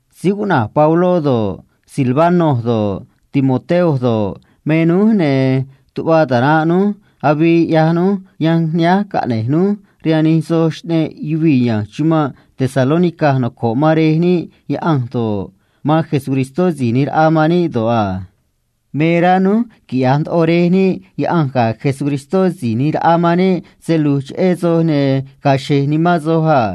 Síí cuꞌna̱j Pabló do̱ꞌ, Silvano do̱ꞌ, Timoteo do̱ꞌ, me núj, ne̱ ꞌyaj núj yanj nihánj caꞌne̱j núj rihaan nij soj xꞌneꞌ yuvii̱ ya̱nj chumanꞌ Tesalónica noco̱ꞌ man Rej níꞌ Yaꞌanj do̱ꞌ, man Jesucristó Si̱j ꞌNi̱j Raꞌa man níꞌ do̱ꞌ a. Me rá núj quiꞌya̱j ndoꞌo Rej níꞌ Yaꞌanj ga̱ Jesucristó Si̱j ꞌNi̱j Raꞌa man níꞌ se lu̱j cheꞌé soj, ne̱ ga̱a̱ xe̱j nimán soj a.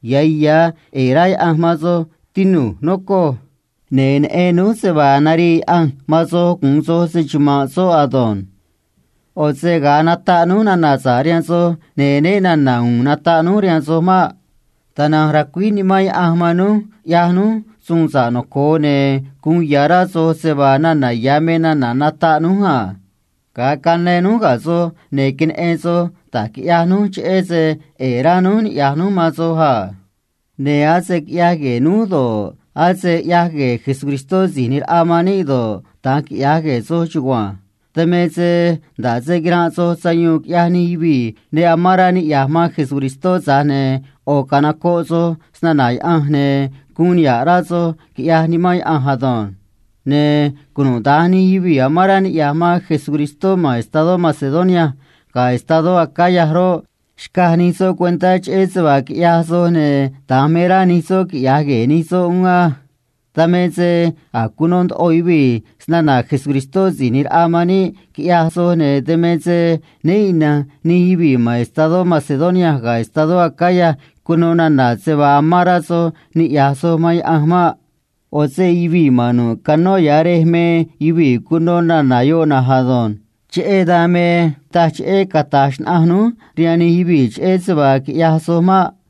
Ya̱ ya̱ ꞌe̱e̱ rá Yaꞌanj man soj, tinu̱j, nocoj. Ne̱ neꞌen núj se vaa narii Yaꞌanj man soj gu̱un soj se‑chuma̱nꞌ soꞌ ado̱nj. ꞌO̱ se ga̱a nataꞌ núj nana̱ sa̱ꞌ cheꞌé Cristó rihaan soj, ne̱ né na̱na̱ u̱u̱n nataꞌ núj rihaan soj maꞌ. Tana̱nj racuíj Nimán Yaꞌanj man núj ꞌyaj núj suun sa̱ꞌ noco̱o, ne̱ guun ya̱ rá soj se vaa nana̱ ya̱ me nana̱ nataꞌ núj a. Ga̱a cayáán núj ga̱ soj, ne̱ queneꞌen soj da̱j quiꞌyaj núj cheꞌé se ꞌe̱e̱ rá núj niꞌya̱j núj man soj a. Ne̱ ase quiꞌyaj gue̱e̱ núj do̱ꞌ, ase ꞌyaj gue̱e̱ Síí ꞌNi̱j Raꞌa man níꞌ do̱ꞌ, da̱nj quiꞌyaj gue̱e̱ soj chugua̱nj. Dan me se nda̱ꞌ se quiranꞌ soj sayuun quiꞌyaj nij yuvii̱ ne nocoꞌ man Cristó, tza̱j ne̱ ꞌo̱ canocoꞌ soj snana̱ Yaꞌanj, ne̱ guun niha̱ꞌ rá soj, quiꞌyaj Nimán Yaꞌanj ado̱nj. Ne̱ cunuda̱nj nij yuvii̱ noco̱ꞌ man Cristó ma̱n estadó Macedonia ga̱ estadó Acaya roꞌ, xcaj nij soꞌ cuentá cheꞌé se vaa quiꞌyaj soj, ne̱ da̱nj me rá nij soꞌ quiꞌya̱j gue̱e̱ nij soꞌ uún ado̱nj. Dan me se a̱j cuno ndoꞌo yuvii̱ snana̱ Síí ꞌNi̱j Raꞌa man níꞌ, quiꞌyaj soj, ne̱ dan me se né ina̱nj nij yuvii̱ ma̱n estadó Macedonia ga̱ estadó Acaya cuno nana̱ se vaa amán rá soj niꞌya̱j soj man Yaꞌanj maꞌ. ꞌO̱ se yuvii̱ ma̱n nu̱ꞌ canó ya̱ rej cuno nana̱ yoꞌ na̱nj ado̱nj. Cheꞌé dan me taj cheꞌé cata̱j xnaꞌanj núj rihaan nij yuvii̱ cheꞌé se vaa quiꞌyaj soj maꞌ.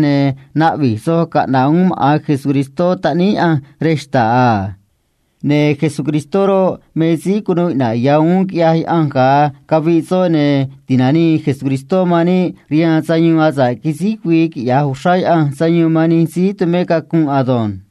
ne̱ naꞌvi̱j soj caꞌna̱ꞌ uún maꞌa̱n Jesús Taꞌníí Yaꞌanj rej xta̱ꞌ a. Ne̱ soꞌ roꞌ, me síí cunuu iꞌna̱ꞌ ya̱ uún quiꞌyaj Yaꞌanj ga̱a caviꞌ soꞌ, ne̱ ti̱nanii Jesús man níꞌ rihaan sayuun asa̱ꞌ quisíj güii quiꞌya̱j uxrá Yaꞌanj sayuun man nij síí tumé cacunꞌ ado̱nj.